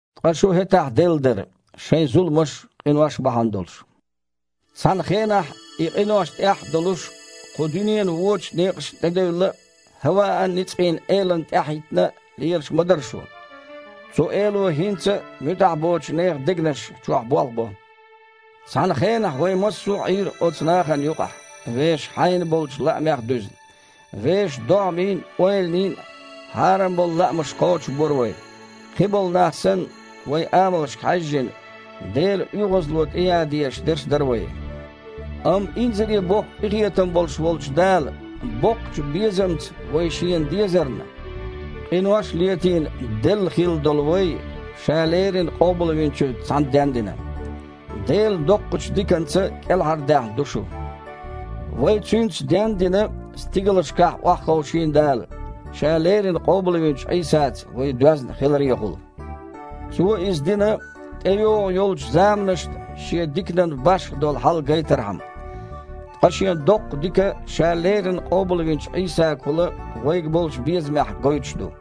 Ткъа шу хІетахь делла дара, шайн зуламаш а, къинош а бахьана долуш. Цхьана хенахь, и къинош тІехь а долуш, кху дуьненан вочу некъашна тІедевлла а, хІаваан ницкъийн элана тІаьхьахІиттина а лелаш ма дара шу. Цу эло хІинца а муьтІахь боцучу нехан дегнаш чохь болх бо. Цхьана хенахь вай массо а Іийра оцу нахана юкъахь, вешан хьайна болчу лаамех а дуьзна. Вешан догІмийн а, ойланийн а хьарам болу лаамаш кхочушбора вай. Кхиболу нах санна, вайн амалшка хьаьжжина, Делан оьгІазло тІеян дезаш дерш дара вай. Амма инзаре боккха къинхетам болуш волчу Дала, боккхачу безамца вай Шена дезарна, къинош а летийна, делла хилла долу вай, Ша леррина Къобалвинчуьнца цхьаьна дендина. Делан доккхачу диканца кІелхьардаьхна ду шу. Вай Цуьнца, ден а дина, стигалшкахь охьаховшийна Дала, Ша леррина къобалвинчу Іийсаца вай доьзна хиларехула. Цо иза дина, тІейогІун йолчу заманашна Шен диканан башха долу хьал гайтархьама. Ткъа Шен доккха дика Ша леррина къобалвинчу Іийсагахула вайга болчу безамехь гойтуш ду.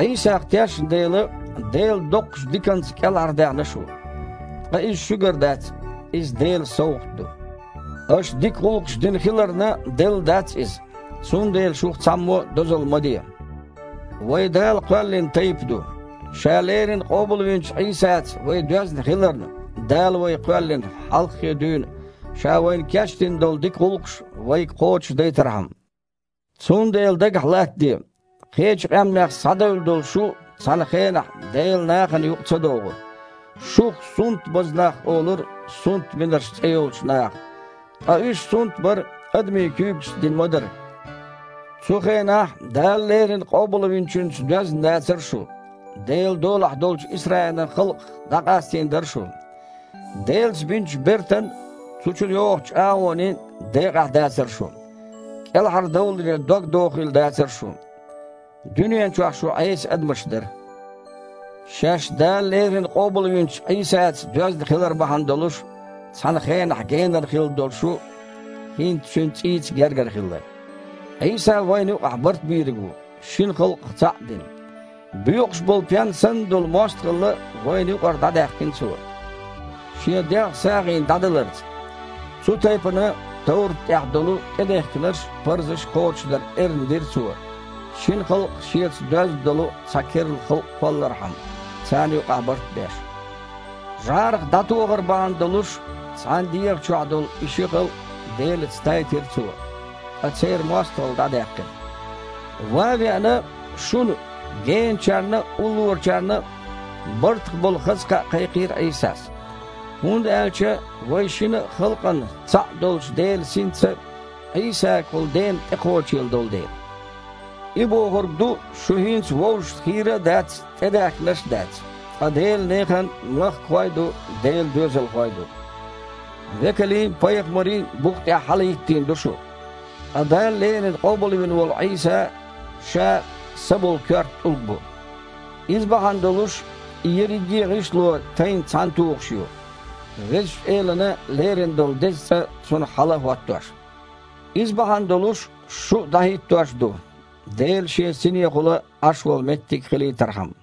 Іийсах тешна дела, Делан доккхачу диканца кІелхьардаьхна шу. Ткъа иза шуьгара дац. Иза Делан совгІат ду. Аша дика гІуллакхаш дина хиларна делла дац иза, цундела шух цхьаммо а дозалла ма де. Вай Дала кхоьллина тайпа ду. Ша леррина къобалвинчу Іийсаца вай доьзна хиларна, Дала вай кхоьллина, хьалххе дуьйна Ша вайна кечдина долу дика гІуллакхаш вайга кхочушдайтархьама. Цундела дагахь латтаде: кхечу къаьмнех схьадевлла долу шу цхьана хенахь Делан нахана юкъа ца догІура. Шух «сунтбаза нах» олура «сунтбинарш» цІе йолчу наха, ткъа уьш сунтбар адамийн куьйгашца дина ма дара. Цу хенахь Дала леррина Къобалвинчуьнца доьзна дацара шу. Делан долахь долчу Исраилан халкъах дІакъастийна дара шу. Делаца бинчу бертан а, цу чу йогІучу чІагІонийн а декъахь а дацара шу. КІелхьардовларе догдохийла дацара шун. Дуьнен чохь шу Іеса адамаш дара. Шаьш Дала леррина къобалвинчу Іийсаца доьзна хилар бахьана долуш, цхьана хенахь генара хилла долу шу хІинца Цуьнан цІийца гергара хилла. Іийса вайна юкъахь Бартбийриг ву, шина халкъах цхьаъ а дина. Боькъуш болу пен санна долу мостагІалла вайна юкъара дІадаьккхина Цо, Шен дегІ сагІина дІадаларца. Цу тайпана, товрат тІехь долу тІедехкинарш а, парзаш а кхочушдар эрна дира Цо, шина халкъах Шеца доьзна долу цхьа керла халкъ кхоллархьама, царна юкъахь барт а беш. ЖІарах дІатохар бахьана долуш, цхьана дегІа чохь и ши халкъ Делаца тайтира Иза, ткъа церан мостагІалла дІадаьккхира Цо. Ван а веана, шуна, генарчарна а, уллорачарна а, бартах болу хаза кхаъ кхайкхийра Іийсас, хІунда аьлча вайн шина а халкъан цхьаъ долчу Делан Синца Іийсагахула Дена тІекхочийла долу дела. И бохург ду, шу хІинца вовшашна хийра а дац, тІедаьхкинарш а дац, ткъа Делан нехан махкахой а ду, Делан доьзалхой а ду. Векалийн а, пайхамарийн а бух тІехь хьалахІиттийна ду шу. Ткъа Дала леррина къобалвина волу Іийса Ша са болу коьрта тІулг бу. Иза бахьана долуш, и ерриге а гІишло тайна цхьаьнатухуш ю, Везачу Элана лерина долу Деза цІа цунах хьала а хІоттош. Иза бахьана долуш, шу а дІахІиттош ду, Дела Шен Синехула Іаш волу меттиг хилийтархьама.